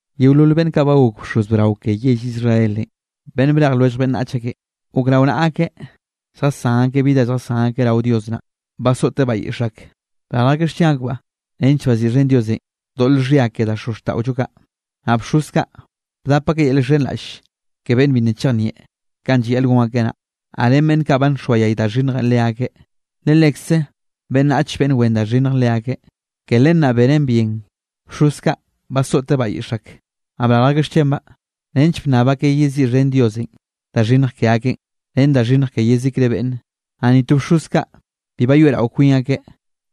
Yeolol beꞌnn kaꞌ ba gok bxoz brao ke yell Israelenꞌ, beꞌnn brej lwellj beꞌnnach ake, gok rao naꞌa akeꞌ lljasán akeꞌ bi da lljasán akeꞌ rao Dios naꞌ, basoꞌteꞌ bayiꞌx ak, brarj akeꞌ xchen akbaꞌ nench baziꞌxhen Diosenꞌ doꞌl xhia ke da xozxtaꞌollo kaꞌ. Naꞌ bxoz kaꞌ bdap akeꞌ yel llxhenraꞌll ke beꞌnn bi nna chejnieꞌ kanꞌ llayaꞌl gon akeꞌ naꞌ, naꞌ ren beꞌnn kaꞌ ba nxoayay da xhinnjenꞌ leakeꞌ, le lekze beꞌnnach beꞌnn wen da xhinnj leakeꞌ. Ke len naꞌ benen bien, bxoz kaꞌ basoꞌte bayiꞌx ak, naꞌ brarj akeꞌ xchenbaꞌ, nench bnnab akeꞌ yeziꞌxhen Diosenꞌ da xhinnj ke akeꞌn ren da xhinnj ke yezikre beꞌnne. Naꞌ ni to bxoz kaꞌ bi bayoeꞌrao kwin akeꞌ,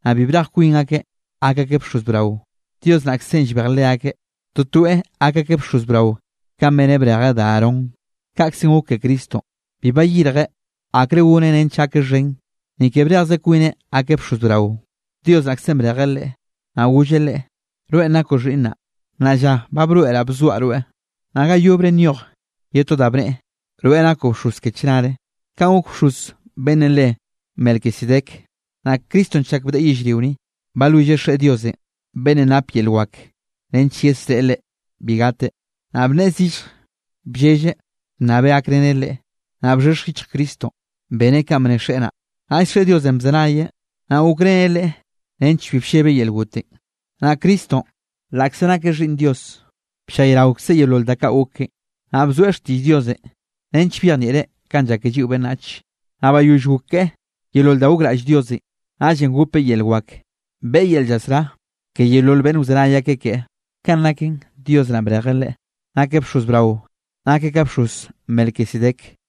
naꞌ bi brej kwin akeꞌ gak akeꞌ bxoz brao, Dios naꞌkzenꞌ llbej leakeꞌ, totoeꞌ gak akeꞌ bxoz brao kanꞌ beneꞌ brejeꞌ da Aarón. Kaꞌkzenꞌ gok ke Cristonꞌ, bi bayirjeꞌ akre goneꞌ nench gakeꞌ xhen, ni ke brejze kwineꞌ gakeꞌ bxoz brao, Dios naꞌkzenꞌ brejeꞌ Leꞌe, naꞌ golleꞌ Leꞌe: Rweꞌn nakoꞌ xhiꞌnnaꞌ, nnaꞌ lla ba broeꞌraꞌ bzoaꞌ rweꞌ. Naꞌ ga yobre nyoj ye to da bneꞌe: Rweꞌ nakoꞌ bxoz ke chnare, kanꞌ gok bxoz beꞌnnenꞌ re Melquisedec. Naꞌ Cristonꞌ chak bdeꞌe yellrio ni, balwilleꞌ Xeꞌe Diosenꞌ beꞌnnenꞌ napeꞌ yel wak nench yesreꞌe Leꞌe bi gateꞌ, naꞌ bnneꞌe zillje bllelleꞌ bnnabeꞌ gakreneꞌ Leꞌe. Naꞌ bxhexj yichj Cristonꞌ, beneꞌ kanꞌ bne Xeꞌe naꞌ, naꞌll Xeꞌe Diosenꞌ bzenayeꞌ, naꞌ gokreneꞌ Leꞌe nench bi bllebeꞌ yel gotenꞌ. Naꞌ Cristonꞌ laꞌkze nakeꞌ Xhiꞌnn Dios, bllayraokzeꞌ yeolol da kaꞌ gok keꞌe, naꞌ bzoeꞌ xtiꞌll Diosenꞌ nench byejnieꞌreꞌ kanꞌ llak ke lliꞌo beꞌnnache. Naꞌ bayoll gok keꞌe yeolol da gokraꞌll Diosenꞌ, naꞌllenꞌ gopeꞌ yel wak, beꞌe yel llasrá ke yeolol beꞌnn wzenay akeꞌ keꞌe. Kanꞌ naken Dios naꞌn, brejeꞌ Leꞌe nakeꞌ bxoz brao, nakeꞌ ka bxoz Melquisedec.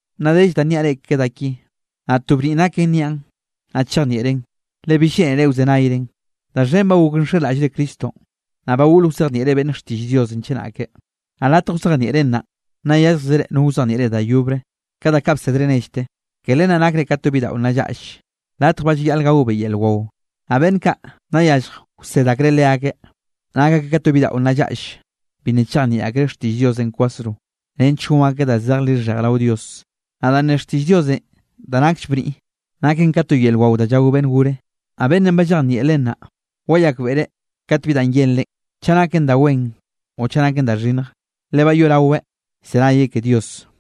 Nna dell da nniaꞌ reꞌ ke da ki, naꞌ to bniꞌ naken nniaꞌn, naꞌ chejnieꞌren, le bill lleꞌnere wzenayren. Da xhen ba gok nxenraꞌllre Cristonꞌ. Ba goꞌl wzejnieꞌre beꞌnne xtiꞌll Diosenꞌ chenake, naꞌ latj wzejnieꞌren naꞌ, nna yálljzere no wzejnieꞌ reꞌ da yobre, ka da kaꞌ bsedre nellte. Ke len naꞌ nakre ka to bidaꞌo nna llaꞌll, latje ba llayaꞌl gaobeꞌ yel wao. Naꞌ beꞌnn kaꞌ nna yallj wsed akreꞌ leakeꞌ, nak akeꞌ ka to bidaꞌo nna llaꞌll, bi nna chejnieꞌ akreꞌ xtiꞌll Diosenꞌ kwasro, nench gon akeꞌ da zej lixhej rao Dios. Naꞌ danꞌ ne xtiꞌll Diosenꞌ da nakll bniꞌ, naken ka to yel wao da llao beꞌnn gore. Naꞌ beꞌnnenꞌ ba llejnieꞌ len naꞌ, wayakbeꞌreꞌ kat bi da yenreꞌ chaꞌ naken da wen o chaꞌ naken da xhinnj, le ba yoꞌraweꞌ llzenayeꞌ ke Dios.